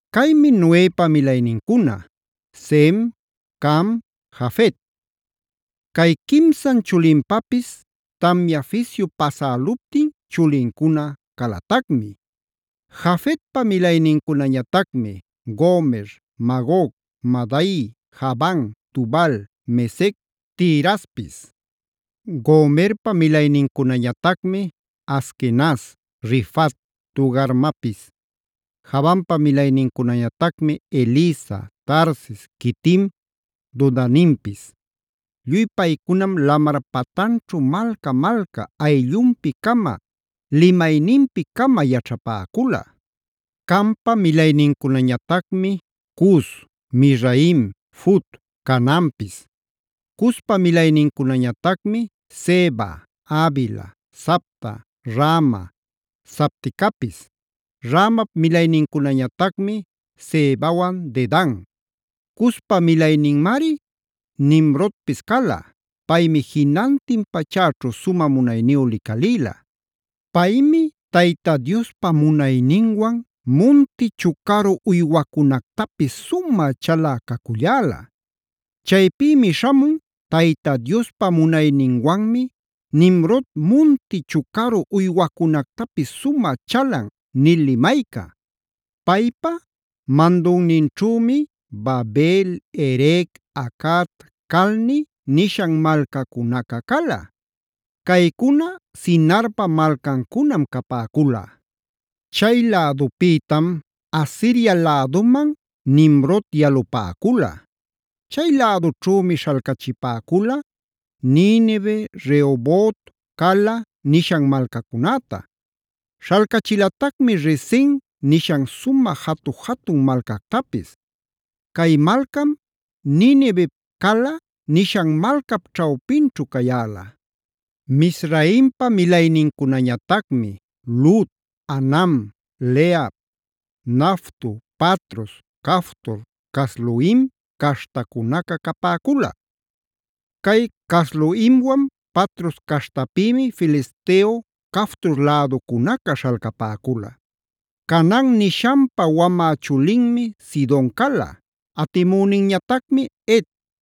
Caymi Noepa milaynincuna: Sem, Cam, Jafet. Cay quimsan chulinpapis tamya fisyu pasäluptin chulincuna calatacmi. Jafetpa milaynincunañatacmi: Gomer, Magog, Madai, Javan, Tubal, Mesec, Tiraspis. Gomerpa milaynincunañatacmi: Askenaz, Rifat, Togarmapis. Javanpa milaynincunañatacmi: Elisa, Tarsis, Quitim, Dodanimpis. Lluy paycunam lamar patanćhu malca-malca ayllunpi-cama, limayninpi-cama yaćhapäcula. Campa milaynincunañatacmi: Cus, Mizraim, Fut, Canaanpis. Cuspa milaynincunañatacmi: Seba, Havila, Sabta, Raama, Sabtecapis. Raamap milaynincunañatacmi Sebawan Dedan. Cuspa milayninmari Nimrodpis cala; paymi jinantin pachäćhu sumä munayniyu licalïla. Paymi Tayta Diospa munayninwan munti chucaru uywacunactapis sumä chalä caculläla. Chaypïmi śhamun: “Tayta Diospa munayninwanmi Nimrod munti chucaru uywacunactapis sumä chalan” nil limayca. Paypa mandunninćhümi: Babel, Erec, Acad, Calne nishan malcacunaca cala. Caycuna Sinarpa malcancunam capäcula. Chay lädupïtam Asiria läduman Nimrod yalupäcula. Chay lädućhümi śhalcachipäcula: Ninive, Rehobot, Cala nishan malcacunäta. Śhalcachilatacmi Resen nishan sumä jatu-jatun malcactapis. Cay malcam Ninivep Cala nishan malcap ćhawpinćhu cayäla. Mizraimpa milaynincunañatacmi: Lud, Anam, Lehab, Naftuh, Patrus, Caftor, Casluhim caśhtacunaca capäcula. Cay Casluhimwan Patrus caśhtapïmi Filisteo Caftor läducunaca śhalcapäcula. Canaan nishanpa wamä chulinmi Sidon cala, atimüninñatacmi Het.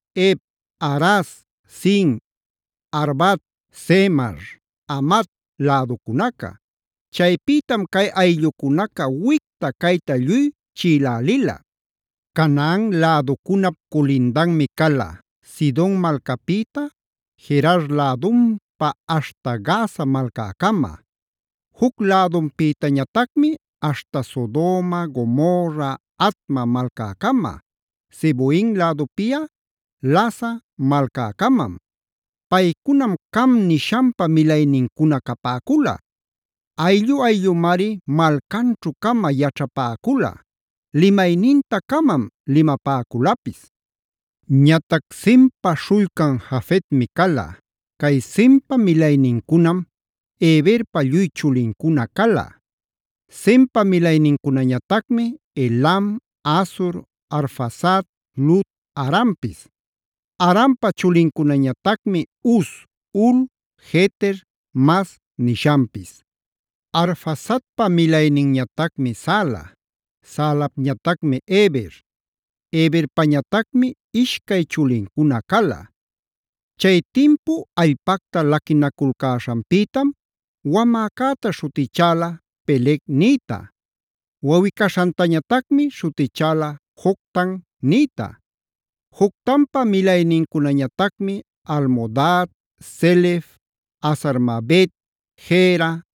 Hev, Araz, Sin, Arvad, Zemar, Hamat läducunaca. Chaypïtam cay ayllucunaca wicta cayta lluy chiꞌilälila. Canaan läducunap culindanmi cala: Sidon malcapïta, Gerar lädunpa aśhta Gaza malcäcama, juc lädunpïtañatacmi aśhta Sodoma, Gomorra, Adma malcäcama, Zeboim lädupiꞌa Lasa malcäcamam. Paycunam Cam nishanpa milaynincuna capäcula; ayllu-ayllumari malcanćhu-cama yaćhapäcula; limayninta-camam limapäculapis. Ñatac Sempa śhullcan Jafetmi cala. Cay Sempa milaynincunam Heberpa lluy chulincuna cala. Sempa milaynincunañatacmi: Elam, Asur, Arfaxad, Lud, Arampis. Arampa chulincunañatacmi: Uz, Hul, Geter, Mas nishanpis. Arfaxadpa milayninñatacmi Sala, Salapñatacmi Heber. Heberpañatacmi ishcay chulincuna cala; chay timpu allpacta laquinaculcäśhanpïtam wamäcäta śhutichäla “Peleg”a nïta; wawꞌi-caśhantañatacmi śhutichäla “Joctan” nïta. Joctanpa milaynincunañatacmi: Almodad, Selef, Hazar-mavet, Jera,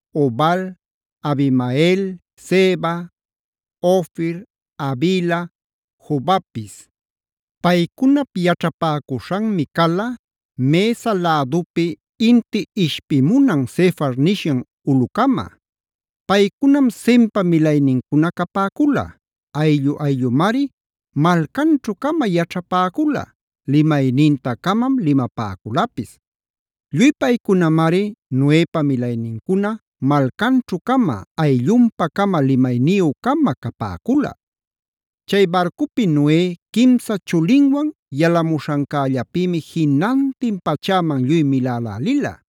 Obal, Abimael, Seba, Ofir, Havila, Jobabpis. Paycunap yaćhapäcuśhanmi cala Mesa lädupi inti ishpimunan Sefar nishan ulꞌucama. Paycunam Sempa milaynincuna capäcula; ayllu-ayllumari malcanćhu-cama yaćhapäcula; limayninta-camam limapäculapis. Lluy paycunamari Noepa milaynincuna malcanćhu-cama, ayllunpa-cama limayniyü-cama capäcula. Chay barcupi Noe quimsa chulinwan yalamuśhancällapïmi jinantin pachäman lluy milälälila.